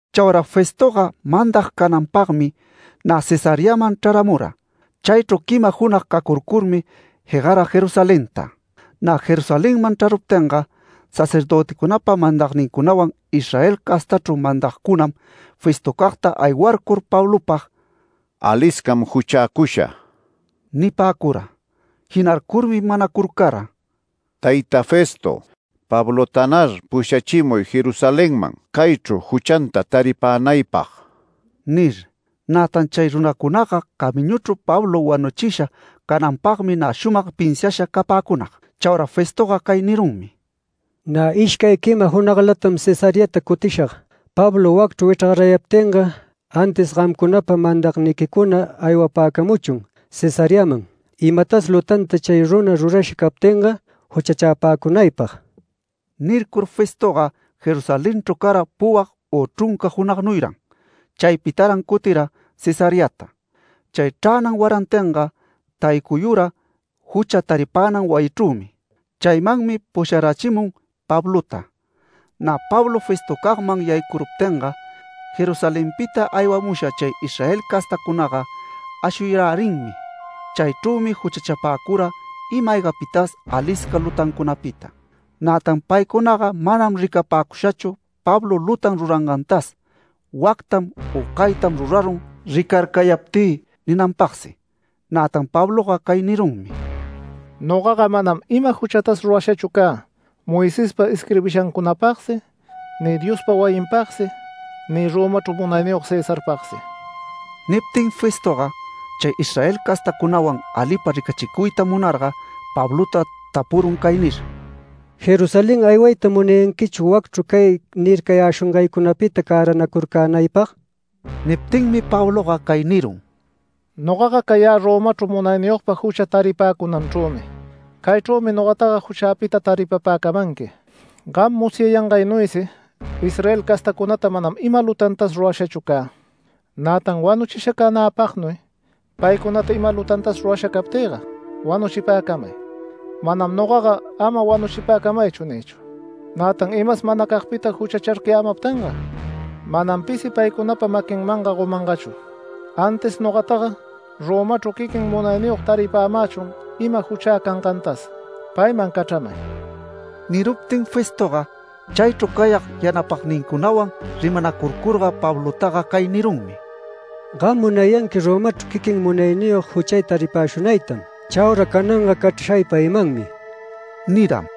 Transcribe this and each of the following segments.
Chaura Festoga mandag cananpagmi nä Cesareaman chraramura. Chaychru quima junag cacurcurmi, jegara Jerusalenta. Nä Jerusalenman chraruptinga, sacerdöticunapa mandagnincunawan Israel castachru mandagcunam Festocagta aywarcur Pablopag “Aliscam juchäcusha” nipäcura. Jinarcurmi manacurcara: “Tayta Festo, Pablotanar pushachimuy Jerusalenman, caychru juchanta taripänaypag” nir. Nätan chay runacunaga camiñuchru Pablo wanuchisha cananpagmi nä shumag pinsiasha capäcunag. Chaura Festoga cay nirunmi “Nä ishcay quima junaglatam Cesareata cutishag. Pablo wacchru wichrgarayaptinga, antis gamcunapa mandagniquicuna aywapäcamuchun Cesareaman, imatas lutanta chay runa rurasha captinga juchachapäcunaypag”. Nircur Festoga Jerusalenchru cara puwag u chrunca junagnuyran. Chaypitaran cuticura Cesareata. Chay chränan warantinga taycuyura jucha taripänan wayichrümi. Chaymanmi pusharachimun Pablota. Nä Pablo Festocagman yaycuruptinga, Jerusalenpita aywamusha chay Israel castacunaga ashuyarärinmi. Chaychrümi juchachapäcura ima-aygapitas alisca lutancunapita. Nätan paycunaga manam ricapäcushachu Pablo lutan rurangantas “Wactam u caytam rurarun ricarcayaptï” ninanpagsi. Nätan Pabloga cay nirunmi: “Nogaga manam ima juchatas rurashachu cä, Moisespa isquirbishancunapagsi ni Diospa wayinpagsi ni Romachru munayniyog Cesarpagsi”. Niptin Festoga chay Israel castacunawan alipa ricachicuyta munarga Pablota tapurun cay nir: “¿Jerusalén aywayta munayanquichu wacchru cay nircayäshungaycunapita cäranacurcänaypag?” Niptinmi Pabloga cay nirun: “Nogaga cayä Romachru munayniyogpa jucha taripäcunanchrümi. Caychrümi nogataga juchäta taripapäcamanqui. Gam musyayangaynuysi Israel castacunata manam ima lutantas rurashachu cä. Nätan wanuchisha canäpagnuy paycunata ima lutantas rurasha captïga wanuchipäcamay. Manam nogaga ‘Ama wanuchipacamaychu’ niychu. Nätan imas manacagpita juchachapäcamaptinga, manam pisi paycunapa maquinmanga gomanmanchu, antis nogataga Romachru quiquin munayniyog taripämächun ima juchä cangantas. Payman cachramay”. Niruptin Festoga chaychru cayag yanapagnincunawan rimacurcurga Pablotaga cay nirunmi: “Gam munayanqui Romachru quiquin munayniyog juchay taripäshunaytam. Chaura cananga cachrashay paymanmi” niram.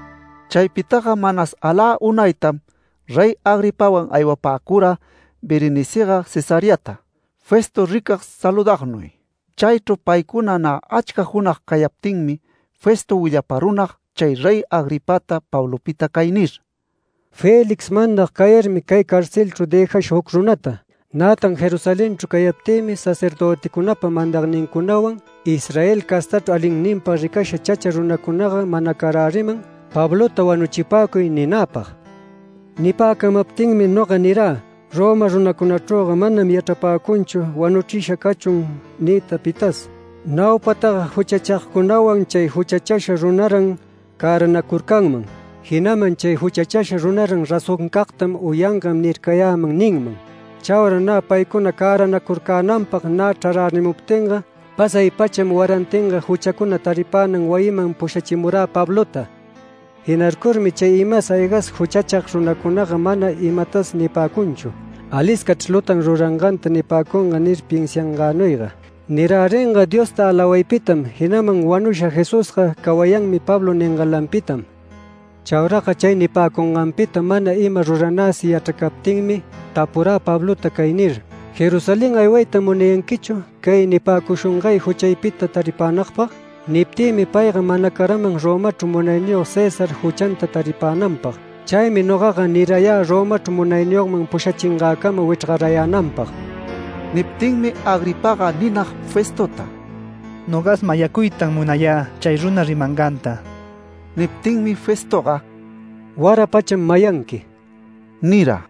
Chaypitaga manas alä unaytam Rey Agripawan aywapäcura Berenicega Cesareata, Festo ricag saludagnuy. Chaychru paycuna nä achca junag cayaptinmi, Festo willaparunag chay Rey Agripata Pablopita cay nir: “Félix mandag cayarmi, cay carcelchru dëjasha juc runata. Nätan Jerusalenchru cayaptïmi, sacerdöticunapa mandagnincunawan Israel castachru alinninpag ricasha chacha runacunaga manacaräriman ‘Pablota wanuchipäcuy’ ninäpag. Nipäcamaptinmi noga nirä: Roma runacunachrüga manam yachrapäcunchu ‘Wanuchisha cachun’ niyta pitas, ‘Naupataga juchachagcunawan chay juchachasha runaran cäranacurcanman’, jinaman ‘Chay juchachasha runaran razoncagtam u yangan nircayäman’ ninman. Chaura paycuna cäranacurcänanpag nä chrarärimuptinga, pasay-pacham warantinga juchacuna taripänan wayiman pushachimurä Pablota. Jinarcurmi chay imas aygas juchachag runacunaga mana imatas nipäcunchu, ‘Aliscachr lutan ruranganta’ nipäcunga nir pinsiangänuyga. Niräringa Diosta alawaypitam, jinaman wanusha Jesusga ‘Cawayanmi’ Pablo ningalanpitam. Chauraga chay nipäcunganpita mana ima ruranäsi yachracaptinmi, tapurä Pablota cay nir: ‘¿Jerusalén aywayta munayanquichu cay nipäcushungay juchaypita taripänagpag?’ Niptïmi payga manacaraman Romachru munayniyog César juchanta taripänanpag. Chaymi nogaga nirayä Romachru munayniyogman pushachingäcama wichrgarayänanpag”. Niptinmi Agripaga ninag Festota: “Nogas mayacuytam munayä chay runa rimanganta”. Niptinmi Festoga “Wara pacham mayanqui” nira.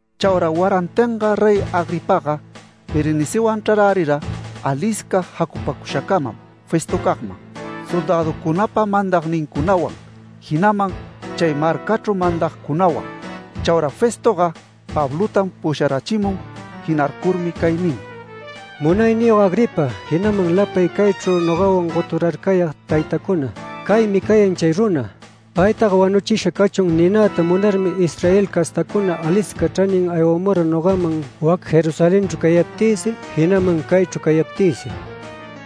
Chaura warantinga Rey Agripaga Berenicewan chrarärira alisca jacupäcushacamam Festocagman, soldäducunapa mandagnincunawan, jinaman chay marcachru mandagcunawan. Chaura Festoga Pablotam pusharachimun. Jinarcurmi cay nin: “Munayniyog Agripa, jinaman lapay caychru nogawan goturarcayag taytacuna, caymi cayan chay runa. Paytaga ‘Wanuchisha cachun’ ninäta munarmi Israel castacuna alisca chranin aywamura nogaman wac Jerusalenchru cayaptïsi, jinaman caychru cayaptïsi.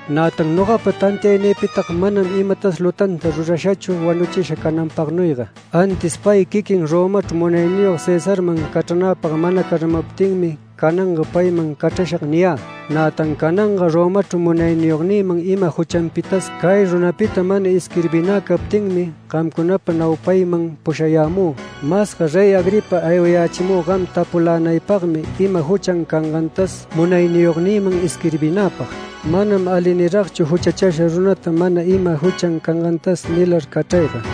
Nätan nogapa tantiaynïpitaga manam imatas lutanta rurashachu wanuchisha cananpagnuyga. Antis pay quiquin Romachru munayniyog Cesarman cachranäpag manacaramaptinmi, cananga ‘Payman cachrashag’ niyä. Nätan cananga Romachru munayniyognïman ima juchanpitas cay runapita mana isquirbinä captinmi, gamcunapa naupayman pushayämü. Masga Rey Agripa, aywayächimü gam tapulänaypagmi ima juchan cangantas munayniyognïman isquirbinäpag. Manam ali niragchu juchachasha runata mana ima juchan cangantas nilar cachrayga”.